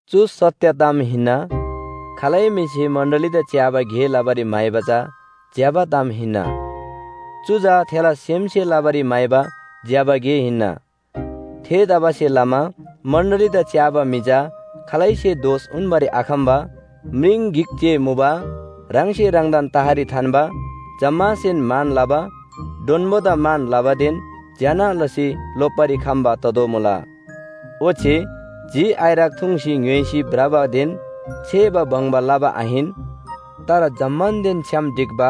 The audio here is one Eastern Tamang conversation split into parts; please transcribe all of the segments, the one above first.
चु सत्‍य ताम हिन्‍ना। खालै म्‍हिसे मण्‍डलीदा च्‍याबा गे लबारी म्‍हाइबा चा ज्‍यबा ताम हिन्‍ना। चु चा थेला सेमसे लबारी म्‍हाइबा ज्‍यबा गे हिन्‍ना। थेतबासेलमा मण्‍डलीदा च्‍याबा म्‍हि चा खालैसे दोष उन्‍बारी आखम्‍बा, म्रिङ गिक जे मुबा, ह्राङसे ह्राङदान तहरी थान्‍बा, जम्‍मासेन मान लबा, डोन्‍बोदा मान लबादेन ज्‍यना लसी लोप्‍बारी खम्‍बा ततोःमुला। ओच्‍छे झि आइरक थुङ्सी ङ्‌य्‍होइसी भ्रबादेन छेबा बङ्बा लबा आहिन, तर जम्‍मानदेन छ्‌याम ढिक्‍बा,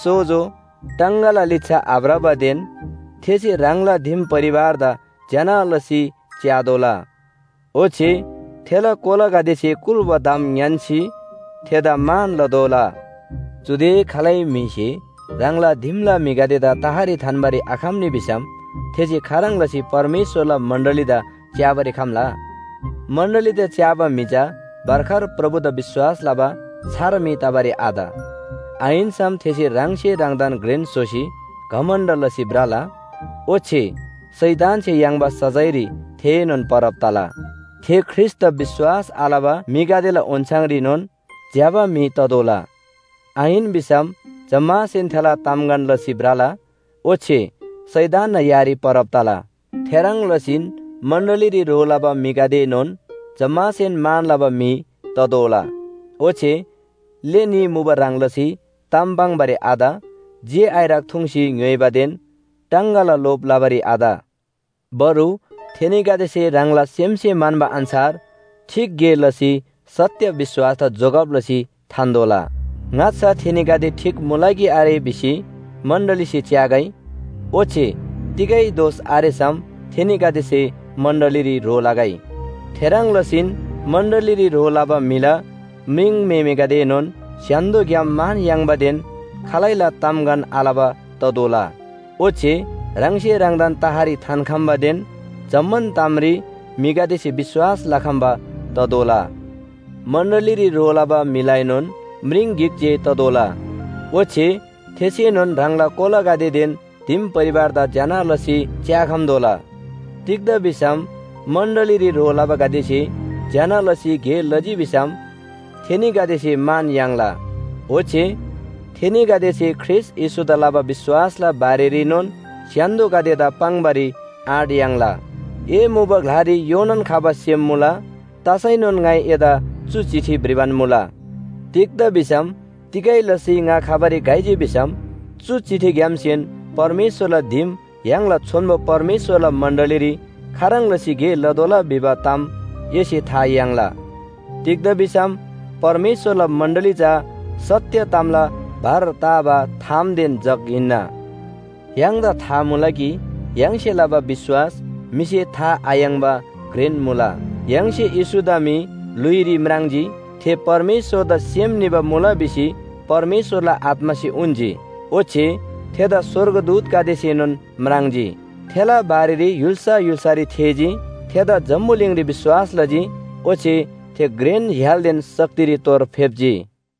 सोजो, टाङगाला लिच्‍छा आभ्रबादेन, थेसे ह्राङला दिम परिवारदा ज्‍यना लसी च्‍यातोःला। ओच्‍छे थेला कोलागदेसे कुल्‍बा ताम ङ्‌यान्‍सी थेदा मान लतोःला। चुदे खालै म्‍हिसे ह्राङला दिमला म्‍हिगदेदा तहरी थान्‍बारी आखम्‍नी भिसम थेसे खाह्रङ् लसी परमेश्‍वरला मण्‍डलीदा च्‍याबारी खम्‍ला? मण्‍डलीदा च्‍याबा म्‍हि चा भर्खर प्रभुदा विश्‍वास लबा छार म्‍हि तबारी आत। आहिन्‍सम थेसे ह्राङसे ह्राङदान घ्रेन स्‍होसी घमण्‍ड लसी भ्रला। ओच्‍छे शैतानसे याङ्बा सजायरी थेएनोन परब तला। थे ख्रीष्‍टदा विश्‍वास आलबा म्‍हिगदेला ओन्‍छाङरीनोन ज्‍यबा म्‍हि ततोःला, आहिन भिसम जम्‍मासेन थेला तामगन लसी भ्रला ओच्‍छे शैतानना यारी परब तला। थेह्रङ् लसीन मण्‍डलीरी ह्रो लबा म्‍हिगदेएनोन जम्‍मासेन मान लबा म्‍हि ततोःला, ओच्‍छे ले न्‍ही मुबा ह्रङ् लसी ताम पाङ्‌बारी आत, झि आइरक थुङ्सी ङ्‌य्‍होइबादेन टाङगाला लोभ लबारी आत, बरु थेनीगदेसे ह्राङला सेमसे म्‍हन्‍बा अन्‍छार ठीक गे लसी सत्‍य विश्‍वासदा जोगब लसी थान्‍तोःला। ङाच्‍छा थेनीगदे ठीक मुला कि आरे भिसी मण्‍डलीसे च्‍यागै। ओच्‍छे तिगै दोष आरेसम थेनीगदेसे मण्‍डलीरी ह्रो लगै। थेह्रङ् लसीन मण्‍डलीरी ह्रो लबा म्‍हिला म्रिङम्‍हेमेगदेएनोन स्‍य्‍हान्‍दोग्‍याम मान याङ्बादेन खालैला तामगन आलबा ततोःला। ओच्‍छे ह्राङसे ह्राङदान तहरी थान्‍खम्‍बादेन जम्‍मान तामरी म्‍हिगदेसे विश्‍वास लखम्‍बा ततोःला। मण्‍डलीरी ह्रो लबा म्‍हिलाएनोन म्रिङ गिक जे ततोःला ओच्‍छे थेसेनोन ह्राङला कोलागदेदेन दिम परिवारदा ज्‍यना लसी च्‍याखम्‍तोःला। तिग्‍दा भिसम मण्‍डलीरी ह्रो लबागदेसे ज्‍यना लसी गे लजी भिसम थेनीगदेसे मान याङ्ला। ओच्‍छे थेनीगदेसे ख्रीष्‍ट येशूदा लबा विश्‍वासला बारेरीनोन स्‍य्‍हान्‍दोगदेदा पाङ्‌बारी आँट याङ्ला। ए मुबा ग्‍लारी योनान खबा सेम मुला, तसैनोन ङाइ एदा चु चिठी भ्रिबान मुला। तिग्‍दा भिसम तिगै लसी ङा खबारी घइजी भिसम चु चिठीग्‍यामसेन परमेश्‍वरला दिम य्‍हाङला छोन्‍बो परमेश्‍वरला मण्‍डलीरी खाह्रङ् लसी गे लतोःला भिबा ताम एसे था याङ्ला। तिग्‍दा भिसम परमेश्‍वरला मण्‍डली चा सत्‍य तामला भर ताबा थामदेन जग हिन्‍ना। य्‍हाङदा था मुला कि य्‍हाङसे लबा विश्‍वास म्‍हिसे था आयाङ्‍बा घ्रेन मुला, “य्‍हाङसे येशूदा म्‍हि ल्‍हुइरी म्राङ्जी, थे परमेश्‍वरदा सेम निबा मुला भिसी परमेश्‍वरला आत्‍मासे उन्‍जी। ओच्‍छे थेदा स्‍वर्गदूतगदेसेनोन म्राङ्जी। थेला बारेरी य्‍हुल्‍सा य्‍हुल्‍सारी थेःजी, थेदा जम्‍बुलिङरी विश्‍वास लजी, ओच्‍छे थे घ्रेन य्‍हालदेन शक्तिरी तोर फेप्‍जी।”